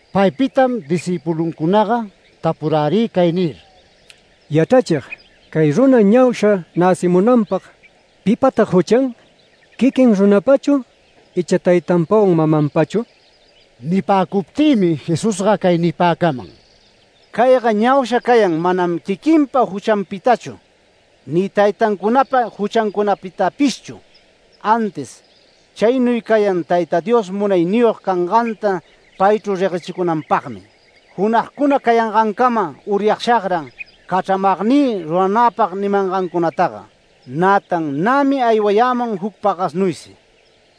Paypitam discïpuluncunaga tapurärï cay nir: “Yachrachig, cay runa ñausha näcimunanpag ¿pipatag juchan? ¿Quiquin runapachu, icha taytanpawan mamanpachu?” Nipäcuptïmi Jesusga cay nipäcaman: “Cayga ñausha cayan manam quiquinpa juchanpitachu ni taytancunapa juchancunapitapishchu, antis chaynuy cayan Tayta Dios munayniyog canganta paychru reguechicunanpagmi. Junagcuna cayangancama uryashagran cachramagnï ruranäpag nimangancunataga, nätan nämi aywayämun juc pagasnuysi.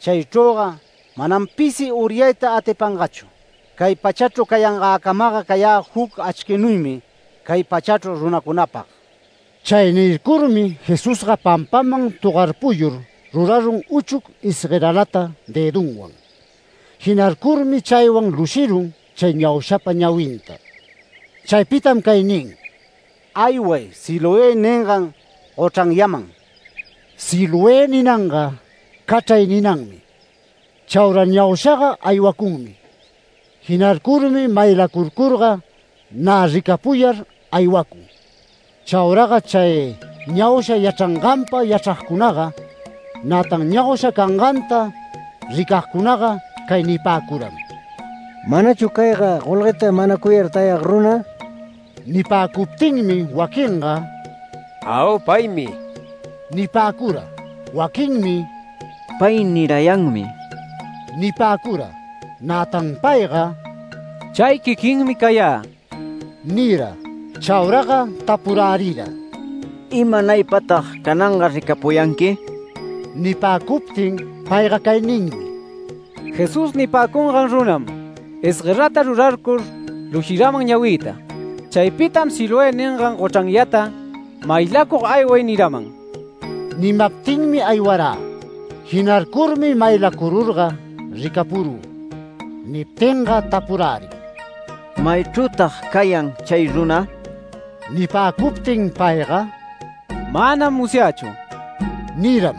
Chaychrüga manam pisi uryayta atipanganchu. Cay pachachru cayangäcamaga cayä juc achquinuymi cay pachachru runacunapag”. Chay nircurmi Jesusga pampaman togarpuyur rurarun uchuc isgueralata dëdunwan. Jinarcurmi chaywan lushirun chay ñaushapa ñawinta. Chaypitam cay nin: “Ayway Siloé ningan gochranyaman”. (‘Siloé’ ninanga ‘cachray’ ninanmi.) Chaura ñaushaga aywacunmi. Jinarcurmi maylacurcurga nä ricapuyar aywacun. Chauraga chay ñausha yachranganpa yachragcunaga, nätan ñausha canganta ricagcunaga cay nipäcuram: “¿Manachu cayga golgueta manacuyar tayag runa?” Nipäcuptinmi waquinga “Au, paymi” nipäcura. Waquinmi “Pay nirayanmi” nipäcura. Nätan payga “Chay quiquinmi cayä” nira. Chauraga tapurärira: “¿Imanaypatag cananga ricapuyanqui?” Nipäcuptin payga cay ninmi: “Jesús nipäcungan runam isguerata rurarcur lushiraman ñawïta. Chaypitam ‘Siloé ningan gochranyata maylacug ayway’ niraman”. Nimaptinmi aywarä. Jinarcurmi maylacururga ricapurü. Niptinga tapurärin: “¿Maychrütag cayan chay runa?” Nipäcuptin payga “Manam musyächu” niram.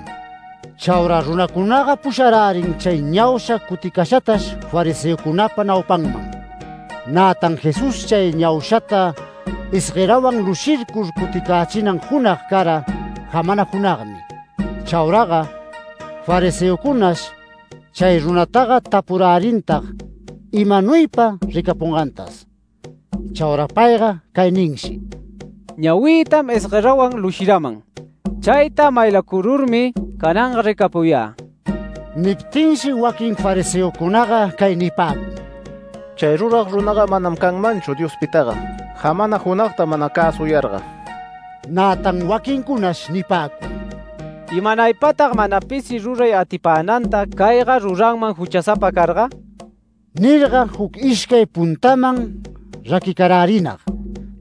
Chaura runacunaga pusharärin chay ñausha cuticashatash fariseocunapa naupanman. Nätan Jesús chay ñaushata isguerawan lushircur cuticächinan junag cara jamana junagmi. Chauraga fariseocunash chay runataga tapurärintag imanuypa ricapungantas. Chaura payga cay ninshi: “Ñawïtam isguerawan lushiraman chayta maylacururmi cananga ricapuyä”. Niptinshi waquin fariseocunaga cay nipäcun: “Chay rurag runaga manam canmanchu Diospitaga jamana junagta mana cäsuyarga”. Nätan waquincunash nipäcun: “¿Imanaypatag mana pisi ruray atipänanta cayga ruranman juchasapa carga?” nirga, juc ishcay puntaman raquicarärinag.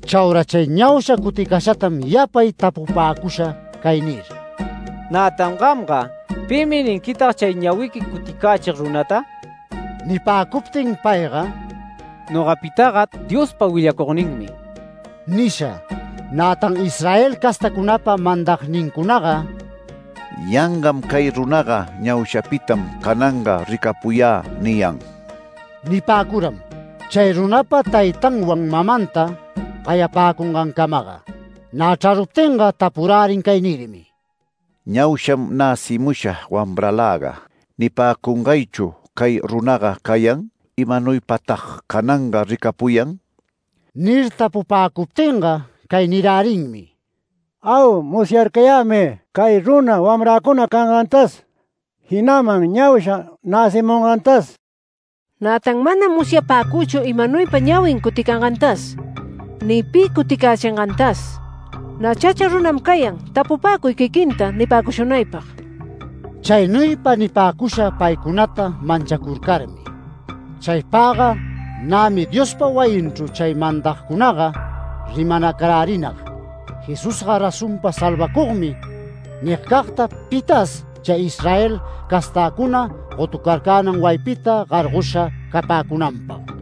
Chaura chay ñausha cuticashatam yapay tapupäcusha cay nir: “Nätan gamga ¿pimi ninquitag chay ñawiqui cuticächig runata?” Nipäcuptin payga “Nogapitaga Diospa willacugninmi” nisha. Nätan Israel castacunapa mandagnincunaga “Yangam cay runaga ‘Ñaushapitam cananga ricapuyä’ niyan” nipäcuram, chay runapa taytanwan mamanta gayapäcungancamaga. Nä chraruptinga tapurärin cay nirmi: “¿‘Ñausham näcimusha wamraläga’ nipäcungaychu cay runaga cayan? ¿Imanuypatag cananga ricapuyan?” Nir tapupäcuptinga cay nirärinmi: “Au. Musyarcayämi cay runa wamräcuna cangantas, jinaman ñausha näcimungantas. Nätan manam musyapäcüchu imanuypa ñawin cuticangantas ni pi cuticächingantas. Nä chacha runam cayan. Tapupäcuy quiquinta nipäcushunaypag”. Chaynuypa nipäcusha paycunata manchacurcarmi. Chaypagga nämi Diospa wayinchru chay mandagcunaga rimanacarärinag “Jesusga razonpa salvacugmi” nigcagta pitas chay Israel castäcuna gotucarcänan wayipita gargosha capäcunanpag.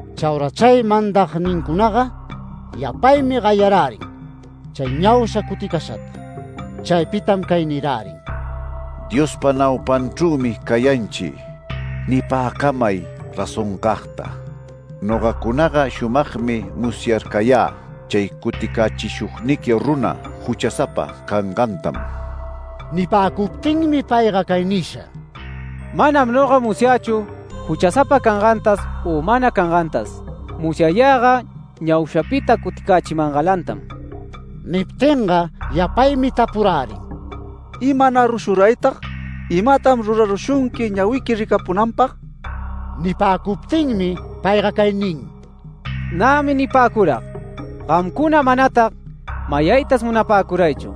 Chaura chay mandagnincunaga yapaymi gayarärin chay ñausha cuticashata. Chaypitam cay nirärin: “Diospa naupanchrümi cayanchi. Nipäcamay razoncagta. Nogacunaga shumagmi musyarcayä chay cuticächishugniqui runa juchasapa cangantam”. Nipäcuptinmi payga cay nisha: “Manam noga musyächu juchasapa cangantas u mana cangantas. Musyayäga ñaushapita cuticächimangalantam”. Niptinga yapaymi tapurärin: “¿Imanarushuraytag? ¿Imatam rurarushunqui ñawiqui ricapunanpag?” Nipäcuptinmi payga cay nin: “Nämi nipäcurag. Gamcuna manatag mayaytas munapäcuraychu.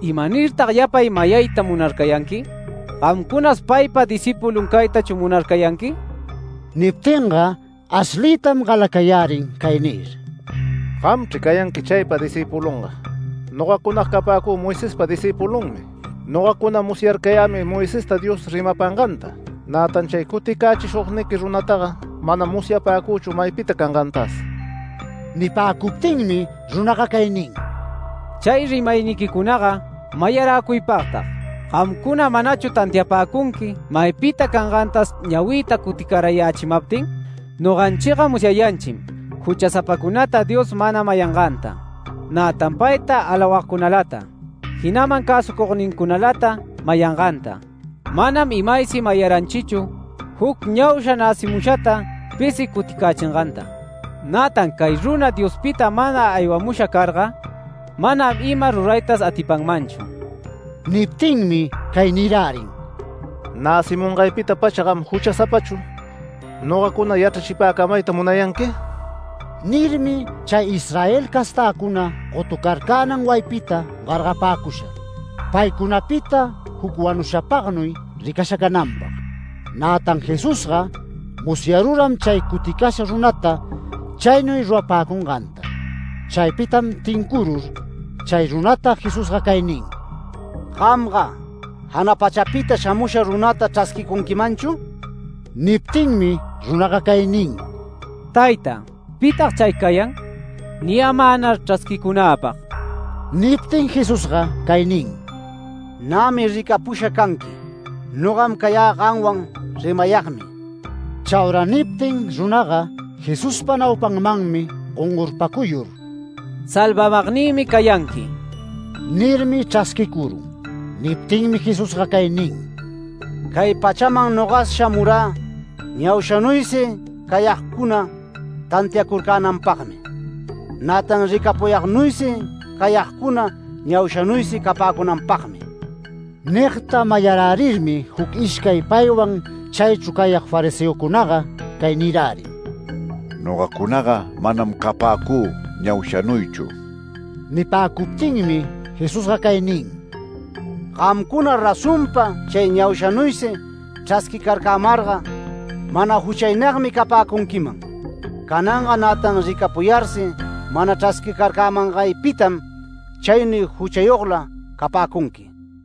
¿Imanirtag yapay mayayta munarcayanqui? ¿Gamcunas paypa discïpulun caytachu munarcayanqui?” Niptinga ashliytam galacayärin cay nir: “Gamchri cayanqui chaypa discïpulunga. Nogacunaga capäcü Moisespa discïpulunmi. Nogacuna musyarcayämi Moisesta Dios rimapanganta. Nätan chay cuticächishugniqui runataga manam musyapäcüchu maypita cangantas”. Nipäcuptinmi runaga cay nin: “¡Chay rimayniquicunaga mayaräcuypagtag! ¿Gamcuna manachu tantiapäcunqui maypita cangantas ñawïta cuticarayächimaptin? Noganchiga musyayanchim juchasapacunata Dios mana mayanganta, nätan payta alawagcunalata, jinaman cäsucugnincunalata mayanganta. Manam imaysi mayaranchichu juc ñausha näcimushata pisi cuticächinganta. Nätan cay runa Diospita mana aywamusha carga, manam ima ruraytas atipanmanchu”. Niptinmi cay nirärin: “¡Näcimungaypita-pacha gam juchasapachu nogacuna yachrachipäcamayta munayanqui!” Nirmi chay Israel castäcuna gotucarcänan wayipita gargapäcusha, paycunapita juc wanushapagnuy ricasha cananpag. Nätan Jesusga musyaruram chay cuticasha runata chaynuy rurapäcunganta. Chaypitam tincurur chay runata Jesusga cay nin: “¿Gamga jana pachapita shamusha runata chrasquicunquimanchu?” Niptinmi runaga cay nin: “Tayta, ¿pitag chay cayan? Niyämänar chrasquicunäpag”. Niptin Jesusga cay nin: “Nämi ricapusha canqui. Nogam cayä gamwan rimayagmi”. Chaura niptin runaga Jesuspa naupanmanmi gongorpacuyur: “Salvamagnïmi cayanqui” nirmi chrasquicurun. Niptinmi Jesusga cay nin: “Cay pachaman noga shamurä ñaushanuysi cayagcuna tantiacurcänanpagmi, nätan ricapuyagnuysi cayagcuna ñaushanuysi capäcunanpagmi”. Nigta mayarärirmi juc ishcay paywan chaychru cayag fariseocunaga cay nirärin: “Nogacunaga manam capäcü ñaushanuychu”. Nipäcuptinmi Jesusga cay nin: “Gamcuna razonpa chay ñaushanuysi chrasquicarcämarga mana juchaynagmi capäcunquiman. Cananga nätan ricapuyarsi mana chrasquicarcämangaypitam chaynuy juchayogla capäcunqui”.